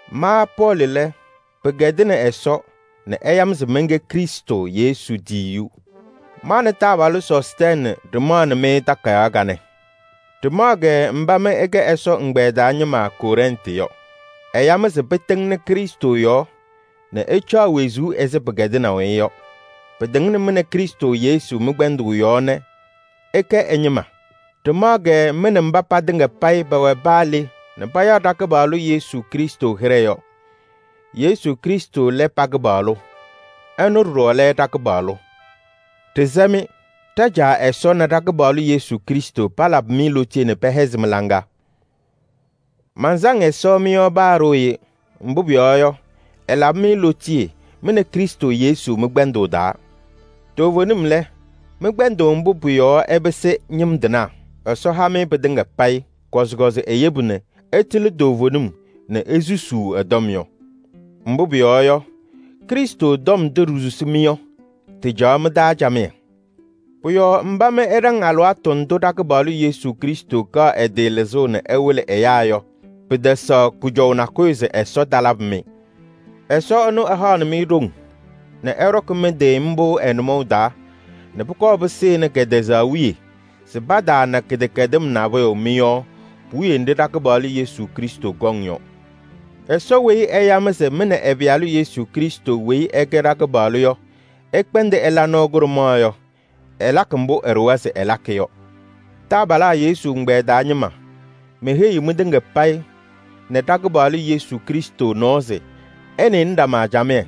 Ma Pɔɔlɩ lɛ, pɩkɛdɩnɩ Ɛsɔ nɛ ɛya-m se mɛnkɛ Krɩstʋ Yesu tiyiyu. Ma nɛ taabalʋ Sɔstɛɛnɩ ɖɩmaɣnɩ-mɩ takayaɣ kanɛ. Ɖɩmaɣ-kɛ mba mɩ ɩkɛ Ɛsɔ ɛgbɛyɛ taa ñɩma Kɔrɛntɩ yɔ. Ɛya-mɩ se pɩtɩŋnɩ Krɩstʋ yɔɔ nɛ ɩcaɣ wezuu ɛzɩ pɩkɛdɩnaʋ-ɩ yɔ. Pɩtɩŋnɩ mɩ nɛ Krɩstʋ Yesu mɩ-kpɛndʋʋ yɔɔ nɛ ɩkɛ ɛ-ñɩma. Ɖɩmaɣ-kɛ mɩ nɛ mba patɩŋa payɩ pɛwɛ paa le nɛ payaɣ ɖa-Kɩpaɣlʋ Yesu Krɩstʋ hɩɖɛ yɔ. Yesu Krɩstʋ lɛ pa-Kɩpaɣlʋ. Ɛnʋ ɖɔɖɔ lɛ ɖa-Kɩpaɣlʋ. Ɖɩsɛ-mɩ: ɖa-Caa Ɛsɔ nɛ ɖa-Kɩpaɣlʋ Yesu Krɩstʋ palabɩ-mɩ lootiye nɛ pɛhɛzɩ mɩ-laŋa. Mansaŋ Ɛsɔ mɩ-tɔm taa alɩwaatʋ kpeekpe. Mbʋ pʋyɔɔ yɔ, ɛlabɩ-mɩ lootiye mɩ nɛ Krɩstʋ Yesu mɩ-kpɛndʋʋ taa. Toovenim lɛ, mɩ-kpɛndʋʋ mbʋ pʋ-yɔɔ ɩpɩsɩ ñɩm tɩnaa, Ɛsɔ ha-mɩ pɩtɩŋa payɩ. Kɔzɩkɔzɩ eyebu nɛ ɩtɩlɩ toovenim nɛ isusuu ɛ-tɔm yɔ. Mbʋ pʋyɔɔ yɔ, Krɩstʋ tɔm ndʋ ɖisusi-mɩ yɔ, tɩcaɣ mɩ-taa camɩyɛ. Pʋ-yɔɔ mba mɩ ɩɖaŋ alɩwaatʋ ndʋ ɖa-Kɩpaɣlʋ Yesu Krɩstʋ kaɣ ɛ-tɩ lɩzʋʋ nɛ ɛwɩlɩ ɛyaa yɔ, pɩtɛsɛɣ kʋjɔʋ nakʋyʋ se Ɛsɔ talabɩ-mɩ. Ɛsɔ ɛnʋ ɛhaɣnɩ-mɩ ɖoŋ nɛ ɩɖɔkɩ mɩ-tɩ mbʋ ɛ-nʋmɔʋ taa nɛ pʋkɔɔ pɩsɩnɩ kɛtɛzaɣ wiye se pataana kɩdɛkɛdɩm nabʋyʋ mɩ-yɔɔ puwiye nɖɩ ɖa-Kɩpaɣlʋ Yesu Krɩstʋ kɔŋ yɔ. Ɛsɔ weyi ɛya-mɩ se mɩ nɛ ɛ-Pɩyalʋ Yesu Krɩstʋ weyi ɛkɛ ɖa-Kɩpaɣlʋ yɔ ɩkpɛndɩ ɩla nɔɔ kʋɖʋmaɣ yɔ, ɛlakɩ mbʋ ɛɖʋwa se ɛlakɩ yɔ. Taabalaa Yesu ɛgbɛyɛ taa ñɩma, meheyiɣ mɩtɩŋa payɩ nɛ ɖa-Kɩpaɣlʋ Yesu Krɩstʋ nɔɔ se ɩnɩnɩ ɖama camɩyɛ.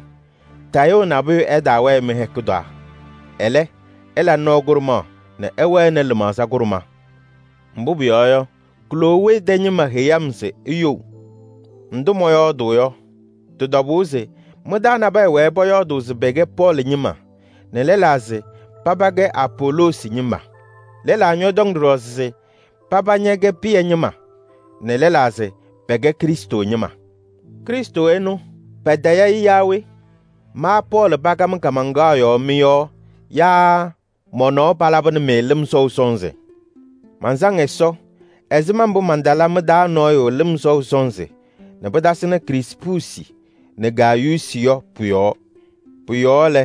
Tayʋʋ nabʋyʋ ɛtaawɛɛ mɩ-hɛkʋ taa. Ɛlɛ, ɩla nɔɔ kʋɖʋmaɣ nɛ ɩwɛnɩ lɩmaɣza kʋɖʋma. Mbʋ pʋyɔɔ yɔ, Klowee tɛ ñɩma heyi-m se iyou. Ndʋ mɔyɔɔdʋʋ yɔ, tɩ-tɔbʋʋ se mɩ-taa nabɛyɛ wɛɛ pɔyɔɔdʋʋ se pɛkɛ Pɔɔlɩ ñɩma nɛ lɛlaa se paba kɛ Apoloosi ñɩma. Lɛlaa ñɔtɔŋ ɖɔɖɔ se paba ñɛkɛ Pɩyɛ ñɩma nɛ lɛlaa se pɛkɛ Krɩstʋ ñɩma. Krɩstʋ ɛnʋ patayɩ-ɩ yaa we? Ma Pɔɔlɩ pakam kaamaŋkaɣ yɔɔ mɩ-yɔɔ yaa mɔ-nɔɔ palabɩnɩ-mɩ lɩm sɔʋ sɔnzɩ? Mansaŋ Ɛsɔ ɛzɩma mbʋ mantala mɩ-taa nɔɔyʋ lɩm sɔʋ sɔnzɩ nɛ pɩtasɩnɩ Krispuusi nɛ Gayuusi yɔ pʋ-yɔɔ. Pʋ-yɔɔ lɛ,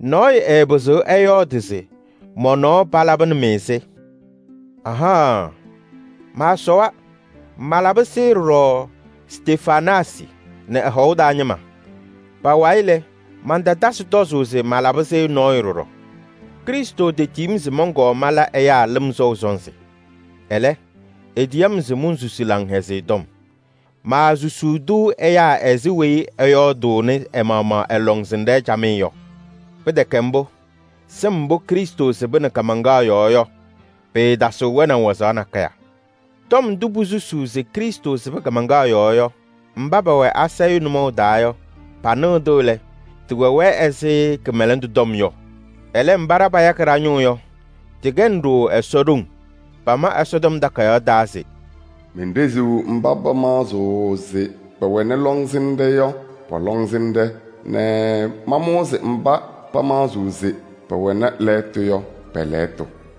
nɔɔyʋ ɛɛpɩzɩɣ ɛyɔɔdɩ se mɔ-nɔɔ palabɩnɩ-mɩ-sɩ. Ahaɣaɣ, maasɔwa! Malabɩ-sɩ ɖɔɖɔ Stefanaasɩ nɛ ɛ-hɔʋ taa ñɩma. Pa-wayɩ lɛ, mantatasɩ tɔzʋʋ se malabɩ-sɩ nɔɔyʋ ɖɔɖɔ. Krɩstʋ tetiyi-m se mɔnkɔɔ mala ɛyaa lɩm sɔʋ sɔnzɩ. Ɛlɛ, etiyi-m se monsusi Laŋhɛzɩyɛ Tɔm. Maasusuu-tʋ ɛyaa ɛzɩ weyi ɛyɔɔdʋʋnɩ ɛ-maɣmaɣ ɛ-lɔŋsɩnɖɛ camɩyɛ yɔ. Pɩtɛkɛ mbʋ, sɩm mbʋ Krɩstʋ sɩbɩ kaamaŋkaɣ yɔɔ yɔ, pɩɩtasɩɣ wɛnaʋ wazaɣ nakɛyɛ. Tɔm ndʋ posusuu se Krɩstʋ sɩbɩ kaamaŋkaɣ yɔɔ yɔ, mba pɛwɛ asayʋʋ nʋmɔʋ taa yɔ, panɩɣ-tʋ lɛ, tɩwɛ-wɛ ɛzɩ kɩmɛlɛndʋ tɔm yɔ. Ɛlɛ, mba ɖa payakɩ ɖa-ñʋʋ yɔ, tɩkɛnɩ-ɖʋ Ɛsɔ ɖoŋ. Pama Ɛsɔtɔm Takayaɣ taa se: “Menɖeziɣ mba pamaɣzɩɣ se pɛwɛnɩ lɔŋsɩnɖɛ yɔ pɔ-lɔŋsɩnɖɛ nɛ mamʋʋzɩ mba pamaɣzɩɣ se pɛwɛnɩ lɛɣtʋ yɔ pɛ-lɛɣtʋ.”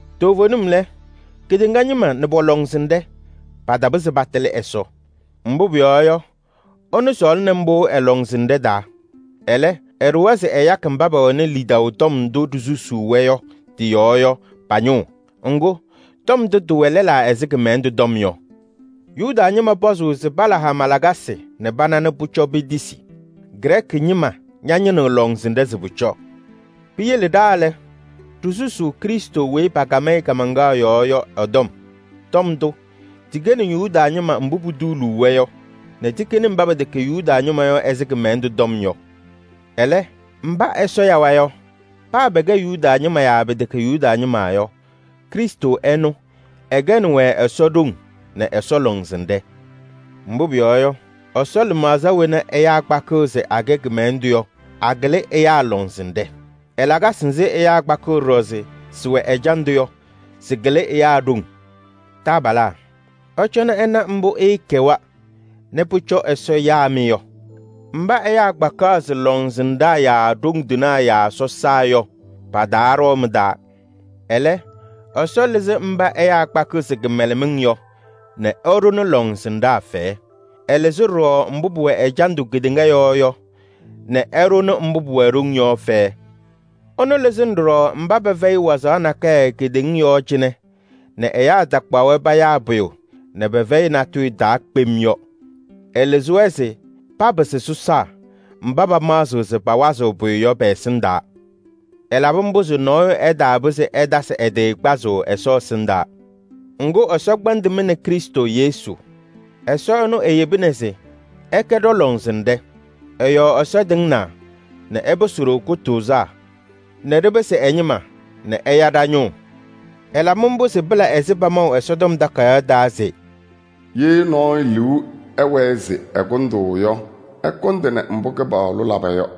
Toovenim lɛ, kedeŋa ñɩma nɛ pɔ-lɔŋsɩnɖɛ patapɩzɩ patɩlɩ Ɛsɔ. Mbʋ pʋyɔɔ yɔ, ɛnʋ sɔɔlɩnɩ mbʋ ɛ-lɔŋsɩnɖɛ taa. Ɛlɛ, ɛɖʋwa se ɛyakɩ mba pɛwɛnɩ lidaʋ tɔm ndʋ ɖisusuu-wɛ yɔ tɩ-yɔɔ yɔ pa-ñʋʋ. Ŋgʋ, tɔm ndʋ tɩwɛ lɛlaa ɛzɩ kɩmɛlɛndʋ tɔm yɔ. Yuda ñɩma pɔzʋʋ se pala hama lakasɩ nɛ pana nɛ pʋcɔ petisi, Grɛɛkɩ ñɩma ñañɩnɩɣ lɔŋsɩnɖɛ se pʋcɔ. Piyele ɖa lɛ, ɖisusuu Krɩstʋ weyi pakam-ɩ kaamaŋkaɣ yɔɔ yɔ ɛ-tɔm. Tɔm ndʋ, tɩkɛnɩ Yuda ñɩma mbʋ putuuluu-wɛ yɔ nɛ tɩkɛnɩ mba pɛtɛkɛ Yuda ñɩma yɔ ɛzɩ kɩmɛlɛndʋ tɔm yɔ. Ɛlɛ, mba Ɛsɔ yawa yɔ, paa pɛkɛ Yuda ñɩma yaa pɛtɛkɛ Yuda ñɩma yɔ, Krɩstʋ ɛnʋ, ɛkɛnɩ-wɛ Ɛsɔ ɖoŋ nɛ Ɛsɔ lɔŋsɩnɖɛ. Mbʋ pʋyɔɔ yɔ, Ɛsɔ lɩmaɣza wena ɛyaa kpakɩɣ se akɛ kɩmɛlɛndʋ yɔ, akɩlɩ ɛyaa lɔŋsɩnɖɛ. Ɛ-lakasɩ nzɩ ɛyaa kpakɩɣ ɖɔɖɔ se sɩwɛ ɛjandʋ yɔ, sɩkɩlɩ ɛyaa ɖoŋ. Taabalaa, ɩcɔnɩ ɩna mbʋ ɩɩkɛwa nɛ pʋcɔ Ɛsɔ yaa-mɩ yɔ. Mba ɛyaa kpakaɣ se lɔŋsɩnɖaa yaa ɖoŋ tɩnaa yaa sɔsaa yɔ, pataaɖɔɔ mɩ-taa. Ɛlɛ, Ɛsɔ lɩzɩ mba ɛyaa kpakɩɣ se kɩmɛlɛmɩŋ yɔ nɛ ɛɖʋnɩ lɔŋsɩnɖaa fɛyɛ. Ɛlɩzɩ ɖɔɖɔ mbʋ pʋwɛ ɛjandʋ kedeŋa yɔɔ yɔ nɛ ɛɖʋnɩ mbʋ pʋwɛ ɖoŋ yɔ fɛyɛ. Ɛnʋ lɩzɩnɩ ɖɔɖɔ mba pɛfɛyɩ wazaɣ nakɛyɛ kedeŋa yɔɔ cɩnɛ nɛ ɛyaa takpaɣ-wɛ payaa pʋyʋ nɛ pɛfɛyɩ natʋyʋ taa kpem yɔ. Ɛlɩzɩ-wɛ se papɩsɩ mba pɛkɛ sɔsaa yɔ mba paawazɩɣ pʋyʋ kpem yɔ. Ɛlabɩ mbʋ se nɔɔyʋ ɛtaapɩzɩ ɛtasɩ ɛ-tɩ kpazʋʋ Ɛsɔ ɛsɩndaa. Ŋgʋ, Ɛsɔ kpɛndɩ mɩ nɛ Krɩstʋ Yesu. Ɛsɔ ɛnʋ eyebina se ɛkɛ ɖɔ-lɔŋsɩnɖɛ. Ɛ-yɔɔ Ɛsɔ tɩŋnaa nɛ ɛpɩsɩ-ɖʋ kʋtʋʋzaa nɛ ɖɩpɩsɩ ɛ-ñɩma nɛ ɛya ɖa-ñʋʋ. Ɛlabɩ mbʋ se pɩla ɛzɩ pamaʋ Ɛsɔtɔm Takayaɣ taa se: “Ye nɔɔyʋ liu ɛwɛɛ se ɛkʋndʋʋ yɔ, ɛkʋndɩnɩ mbʋ Kɩpaɣlʋ laba yɔ.”